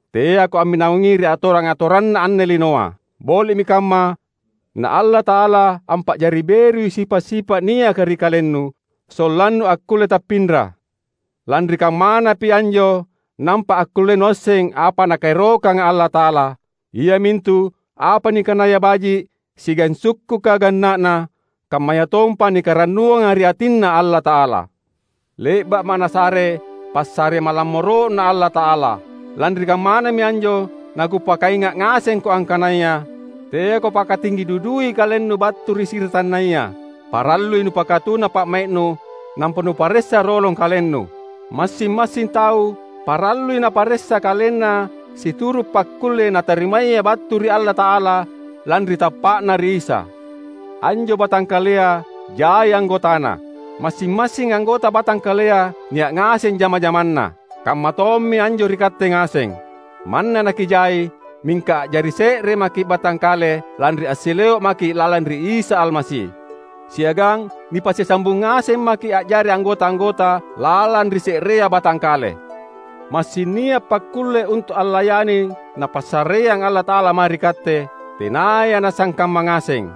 Teako amminawangngi ri atorang-atoranna anne linoa. Boli’mi kamma na Allata’ala ampa’jari berui sipa’-sipa’ niaka ri kalennu, sollannu akkulle tappinra. Lanri kammanapi anjo nampa akkulle nuasseng apa Nakaerokanga Allata’ala — iamintu apa nikanaya baji’, siagang sukkuka ganna’na, kammayatompa nikarannuanga ri atinNa Allata’ala. Le’ba’ma’ Nasare passare malammoro’Na Allata’ala. Lanri kammanami anjo nakupakainga’ ngasengko angkanaya: Teako pakatinggi dudui kalennu battu ri siratannaya. Parallui nupakatuna pa’mai’nu nampa nuparessa rolong kalennu; massing-massing tau parallui naparessa kalenna situru’ pakkulle natarimaya battu ri Allata’ala lanri tappa’na ri Isa. Anjo batangkalea jai anggotana. Massing-massing anggota batangkalea nia’ ngaseng jama-jamanna. Kammatommi anjo ri katte ngaseng. Manna nakijai, mingka a’jari se’re maki’ batangkale lanri assileo’ maki’ lalang ri Isa Almasi. Siagang nipasisambung ngaseng maki’ a’jari anggota-anggota lalang ri se’rea batangkale. Massing nia’ pakkulle untu’ allayani Napassareang Allata’ala mae ri katte, tenaya nasangkamma ngaseng.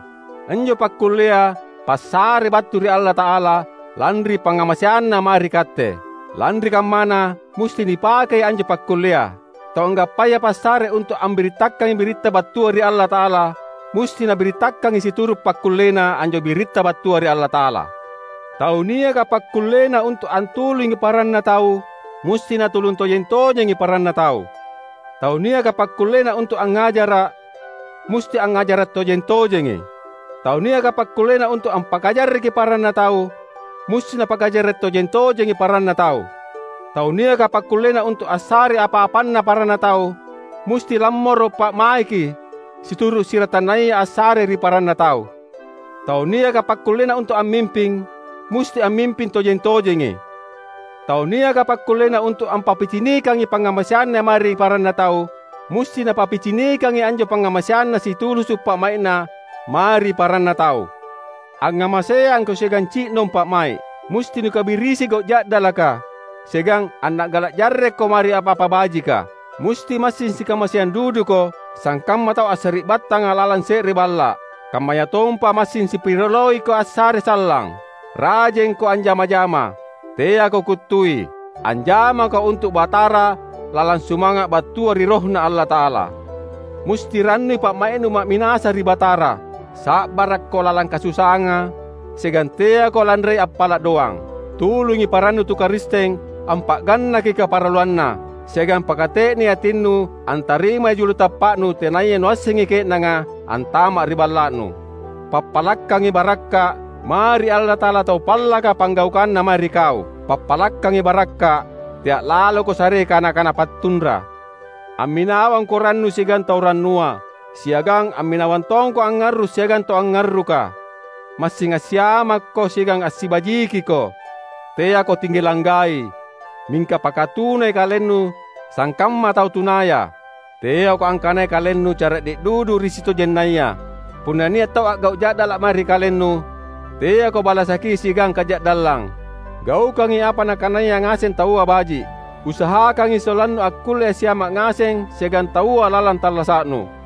Anjo pakkullea, passare battu ri Allata’ala lanri pangngamaseanNa mae ri katte. Lanri kammana, musti nipakei anjo pakkullea. Tau anggappaya passare untu’ ambirittakangi biritta battua ri Allata’ala, musti nabirittakangi situru’ pakkullena anjo biritta battua ri Allata’ala. Tau niaka pakkullena untu’ antulungi paranna tau, musti natulung tojeng-tojengi paranna tau. Tau niaka pakkullena untu’ angngajara’, musti angngajara’ tojeng-tojengi. Tau niaka pakkullena untu’ ampakajarreki paranna tau, musti napakajarre’ tojeng-tojengi paranna tau. Tau niaka pakkullena untu’ assarei apa-apanna paranna tau, musti lammoro’ pa’maiki, situru’ siratannaya assare ri paranna tau. Tau niaka pakkullena untu’ ammimping, musti ammimping tojeng-tojengi. Tau niaka pakkullena untu’ ampappicinikangi pangngamaseanna mae ri paranna tau, musti napappicinikangi anjo pangngamaseanna situlusu’ pa’mai’na mae ri paranna tau. Angngamaseangko siagang ci’nong pa’mai’. Musti nukabirisi gau’ ja’dalaka, siagang anna’gala’ jarrekko mae ri apa-apa bajika. Musti massing sikamaseang duduko sangkamma tau assari’battanga lalang se’re balla’; kammayatompa massing sipirioloiko assare sallang. Rajengko anjama-jama. Teako kuttui. Anjamako untu’ Batara lalang sumanga’ battua ri RohNa Allata’ala. Musti rannui pa’mai’nu ma’minasa ri Batara; sa’barakko lalang kasusaanga, siagang teako lanrei appala’ doang. Tulungi parannu tu Karisteng ampa’gannaki kaparalluanna, siagang pakate’nei atinnu antarimai julu tappa’nu tenaya nuassengi ke’nanga antama’ ri balla’nu. Pappalakkangi barakka’ mae ri Allata’ala tau pallaka panggaukanna mae ri kau. Pappalakkangi barakka’, tea’ laloko sarei kana-kana pattunra. Amminawangko rannu siagang tau rannua; siagang amminawang tongko angngarru’ siagang tau angngarruka. Massing assiamakko siagang assibajikiko. Teako tinggi langgai, mingka pakatunai kalennu sangkamma tau tunaya. Teako angkanai kalennu cara’de’ dudu ri sitojennaya. Punna nia’ tau a’gau’ ja’dala’ mae ri kalennu, teako balasaki siagang kaja’dallang. Gaukangi apa nakanaya ngaseng taua baji’. Usahakangi sollannu akkulle assiama’ ngaseng siagang taua lalang tallasa’nu.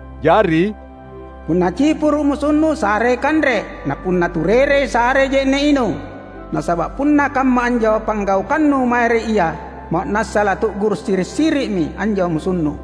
Jari, punna cipuru’ musunnu sarei kanre; na punna turerei, sarei je’ne’ inung. Nasaba’ punna kamma anjo panggaukannu mae ri ia, ma’nassa latu’guru’ siri’-siri’mi anjo musunnu.